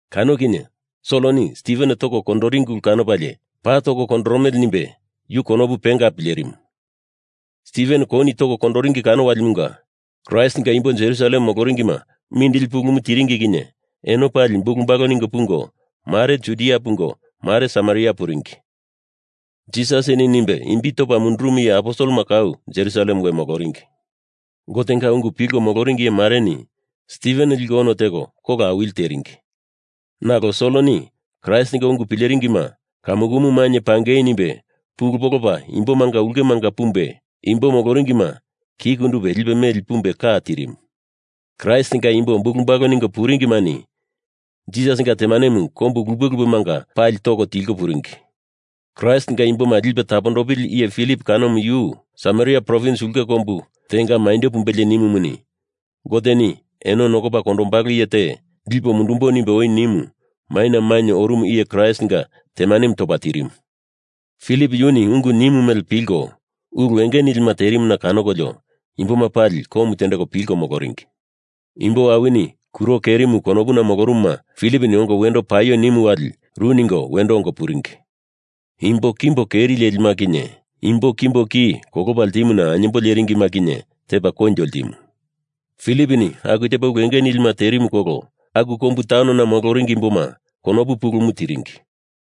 Kano kinye Soloni Stiven toko kondoringi ulu kanopalie paa toko kondoromele nimbe yu konopu penga pilerimu. Stiven kouni toko kondoringi kano walimunga Kraistinga imbo Jerusalem moloringima mindili pulumu tiringi kinye eno pali bulu balu ningo pungo, mare Judia pungo, mare Samaria puringi. Jisasini nimbe imbi topa mundurumu iye aposelema kau Jerusalem we moloringi. Gotenga ungumu pilko moloringi iye mareni Stiven liko ono teko kola awili teringi, nalo Soloni Kraistinga ungu pileringima kamukumu mainye pangei nimbe pulu polopa imbomanga ulkemanga pumbe, imbo moloringima ki kundupe lipe meli pumbe ka tirimu. Kraistinga imbo bulu balu ningo puringimani Jisasinga temanemu kombu lupe lupemanga pali toko tilko puringi. Kraistinga imboma lipe tapondopili iye Filip kanomu yu Samaria provins ulke kombu tenga maindo pumbelie nimumuni Goteni eno nokopa kondombalo iye te lipo mundumbo nimbe oi nimu maina mainye orumu iye Kraistinga temanemu topa tirimu. Filip yuni ungu nimu mele pilko ulu enge nilima terimuna kanokolio, imboma pali komu tendeko pilko moloringi. Imbo awini kuro kerimu konopuna molorumuma Filiponi ongo wendo paio nimu wali ru ningo wendo ongo puringi. Imbo kimbo keri lelima kinye imbo kimbo ki kolopa ltimuna ainyembo leringima kinye tepa koinjo ltimu. Filiponi aku tepa ulu enge nilima terimu kolo aku kombu taunona moloringi imboma konopu pulumu tiringi.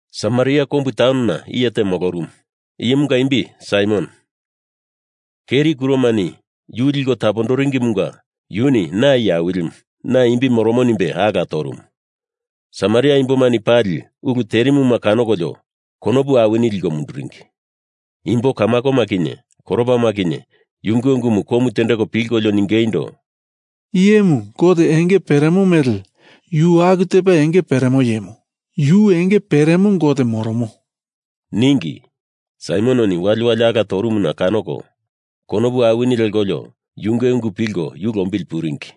Samaria kombu taun kanona iye te molorumu. Iyemunga imbi Saimon. Keri kuromani yu liko tapondoringimunga yuni na iye awilimu, na imbi moromo nimbe ala torumu. Samaria imbomani pali ulu terimuma kanokolio konopu awini liko munduringi. Imbo Kamakoma kinye koropama kinye yunge ungumu komu tendeko pilkolio ningeindo, “Iye imu gote enge peremo mele yu aku tepa enge peremo iyemu. Yu enge peremo gote moromo,” ningi. Saimononi waliwali ala torumuna kanoko konopu awini lekolio yunge ungu pilko yu lombili puringi.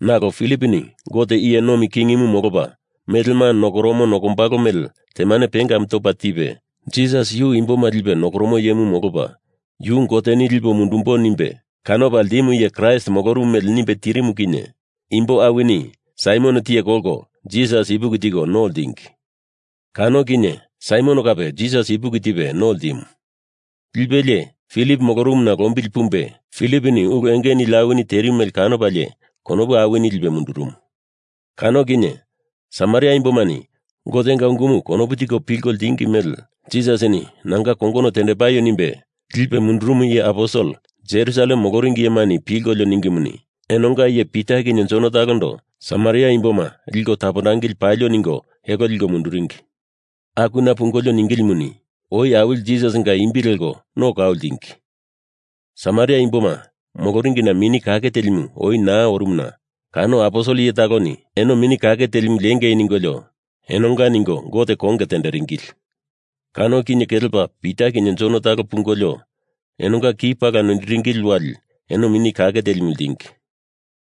Nalo Filiponi Gote iye nomi kingimu molopa melema nokoromo nokombalo mele temane pengamu topa tipe, Jisas yu imboma lipe tapondoromo iyemu molopa yu Goteni lipo Mundumbo nimbe kanopa ltimu iye Kraist molorumu mele nimbe tirimu kinye imbo awini Saimon tiye kolko Jisas ipuki tiko no ltingi. Kano kinye Saimon kape Jisas ipuki tipe no ltimu. Lipelie Filip molorumuna lombili pumbe Filiponi ulu enge nili awini terimu mele kanopalie konopu awini lipe mundurumu. Kano kinye Samaria imbomani Gotenga ungumu konopu tiko pilko ltingi mele Jisasini nanga kongono tendepaio nimbe lipe mundurumu iye aposel Jerusalem moloringi iyemani pilkolio ningimuni, enonga iye Pita kinye Jon talondo Samaria imboma liko tapondangili palio ningo elo liko munduringi. Akuna pungolio ningilimuni oi awili Jisasinga imbi leko no kau ltingi. Samaria imboma moloringina Mini Kake Telimu oi naa orumuna kano aposel iye taloni eno Mini Kake Telimu lengei ningolio enonga ningo Gote konge teringili. Kano kinye kelepa Pita kinye Jon taloni pungolio enonga ki pala noiringili wali eno Mini Kake Telimu ltingi.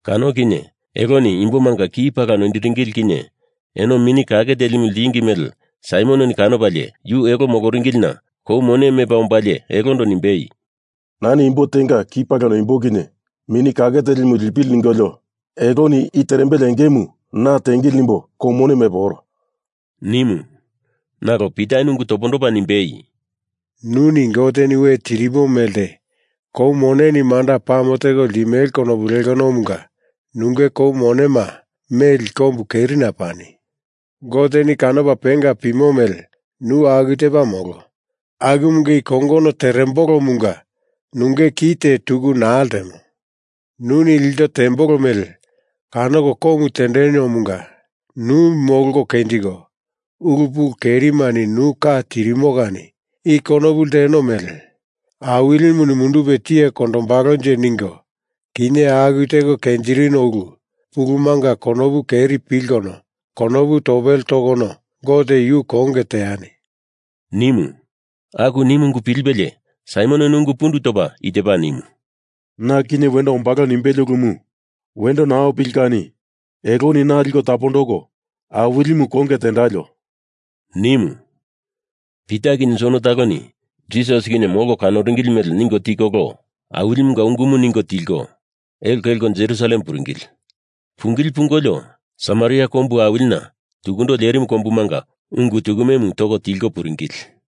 Kano kinye eloni imbomanga ki pala noiringili kinye eno Mini Kake Telimu ltingi mele Saimononi kanopalie yu elo moloringilina kou mone mepa ombalie elondo nimbei, “Nani imbo tenga ki pala noimbo kinye Mini Kake Telimu lipili ningolo eloni i terembele engemu na tiengili nimbo kou mone mepo oro,” nimu. Nalo Pitani ungu topondopa nimbei, “Nuni Goteni we tirimo melte kou moneni manda pame teko ltimele konopu lekonomunga nunge kou monema meli kombu kerina pani. Goteni kanopa penga pimo mele nu aku tepa molo, akumunga i kongono terembolomunga nunge ki te tuku naa ltemo. Nuni ilto tembolo mele kanoko komu tendemomunga nu molko kenjiko ulu pulu kerimani nu ka tirimo kani i konopu lteno mele Awilimuni mundupe tiye kondombalonje ningo, kinye aku teko kenjirino ulu pulumanga konopu keri pilkono konopu topele tokono Gote yu konge teani,” nimu. Aku nimu ungu pilipelie Saimononi ungu pundu topa i tepa nimu, “Na kinye wendo ombalo nimbele ulumu wendo naa opili kani eloni na liko tapondoko Awilimu konge tendalio,” nimu. Pita kinye Jon taloni Jisas kinye molko kanoringili mele ningo tikolo Awilimunga ungumu ningo tilko, elo kelko Jerusalem puringili. Pungili pungolio Samaria kombu awilina tukundo lerimu kombumanga ungu tukumemu toko tilko puringili.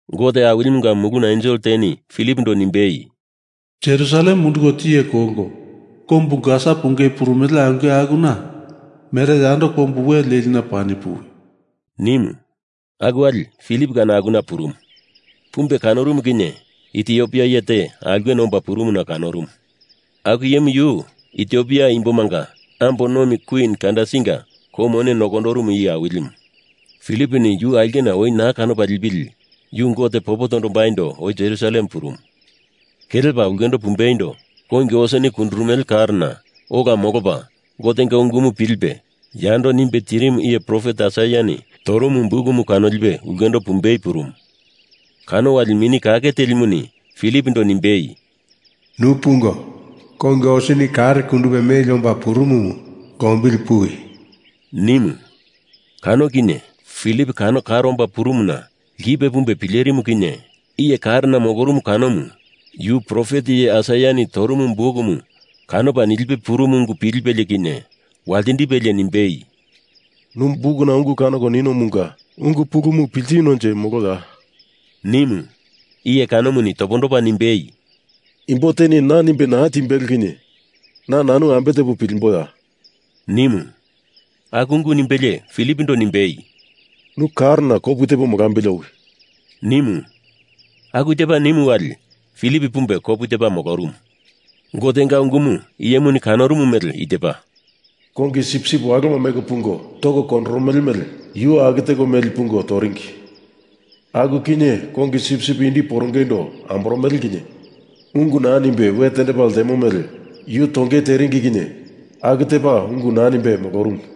Gote Awilimunga muluna ensel teni Filipondo nimbei, “Jerusalem munduko tiye kolko kombu Gasa pungei purumele aulke akuna mere yando kombu we lelina pani puwi,” nimu. Aku wali Filip kano akuna purumu. Pumbe kanorumu kinye Itiopia iye te aulkena omba purumuna kanorumu. Aku iyemu yu Itiopia imbomanga ambo nomi kwin Kandasinga kou mone nokondorumu iye awilimu. Filiponi yu aulkena oi naa kanopa lipili yu Gote popo tombaindo oi Jerusalem purumu. Kelepa ulkendo pumbeindo kongi oseni kundurumele karona ola molopa Gotenga ungumu pilipe yando nimbe tirimu iye profet Aisaiani torumu bukumu kanolipe ulkendo pumbei purumu. Kano wali Mini Kake Telimuni Filipondo nimbei, “Nu pungo kongi oseni karo kundupe meli omba purumumu lombili puwi,” nimu. Kano kinye Filip kano kare omba purumuna lkipe pumbe pilerimu kinye iye karena molorumu kanomu yu profet iye Aisaiani torumu bukumu kanopa nilipe purumu ungu pilipelie kinye waltindipelie nimbei, “Nu bukuna ungu kanoko ninomunga ungu pulumu piltinonje moloya?” nimu. Iye kanomuni topondopa nimbei, “Imbo teni na nimbe naa timbelo kinye na nanu ambe tepo pilimboya?” nimu. Aku ungu nimbelie Filipondo nimbei, “Nu karona kopu tepo molambili owi,” nimu. Aku tepa nimu wali, Filip pumbe kopu tepa molorumu. Gotenga ungumu iyemuni kanorumu mele i tepa, Kongi sipsip waloma meko pungo toko kondoromele mele yu aku teko meli pungo toringi. Aku kinye kongi sipsip indi porongeindo amboromele kinye ungu naa nimbe we tendepa ltemo mele yu tongei teringi kinye aku tepa ungu naa nimbe molorumu.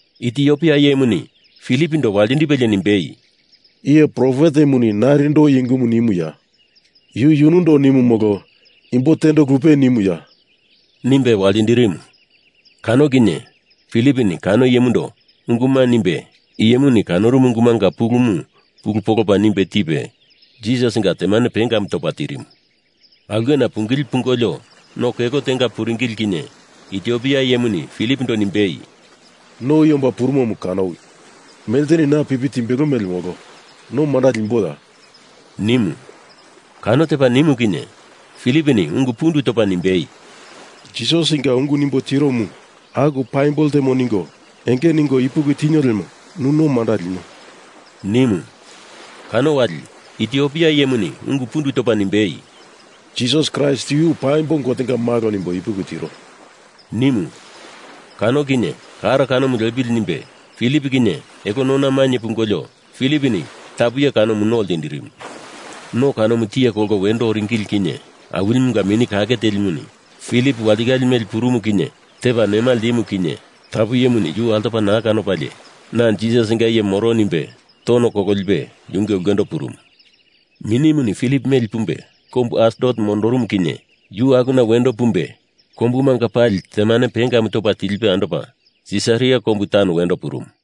Itiopia iyemuni Filipondo waltindipelie nimbei, “Iye profetemuni narindo i ungumu nimuya? Yu yunundo nimu molo imbo tendo lupe nimuya?” nimbe waltindirimu. Kano kinye Filiponi kano iyemundo unguma nimbe iyemuni kanorumu ungumanga pulumu pulu polopa nimbe tipe Jisasinga temane pengamu topa tirimu. Aulkena pungili pungolio no kelo tenga puringili kinye Itiopia iyemuni Filipondo nimbei, “No i omba purumomu kanowi. Melteni na pipi timbelo mele molo no manda limboya?” nimu. Kano tepa nimu kinye Filiponi ungu pundu topa nimbei, “Jisasinga ungu nimbo tiromu aku paimbo ltemo ningo enge ningo ipuki tinio lemo nu no manda linio,” nimu. Kano wali Itiopia iyemuni ungu pundu topa nimbei, “Jisas Kraist yu paimbo Gotenga malo nimbo ipuki tiro,” nimu. Kano kinye karo kanomu lepili nimbe Filip kinye elo nona mainye pungolio Filiponi tapu iye kanomu no ltindirimu. No kanomu tiye kolko wendo oringili kinye Awilimunga Mini Kake Telimuni Filip walitikale meli purumu kinye tepa nema ltimu kani tapu iyemuni yu altopa naa kanopalie na Jisasinga iye moro nimbe tono kololipe yunge ulkendo purumu. Minimuni Filip meli pumbe kombu Asdot mondorumu kinye yu akuna wendo pumbe kombumanga pali temane pengamu topa tilipe andopa Sisaria kombu taun wendo purumu.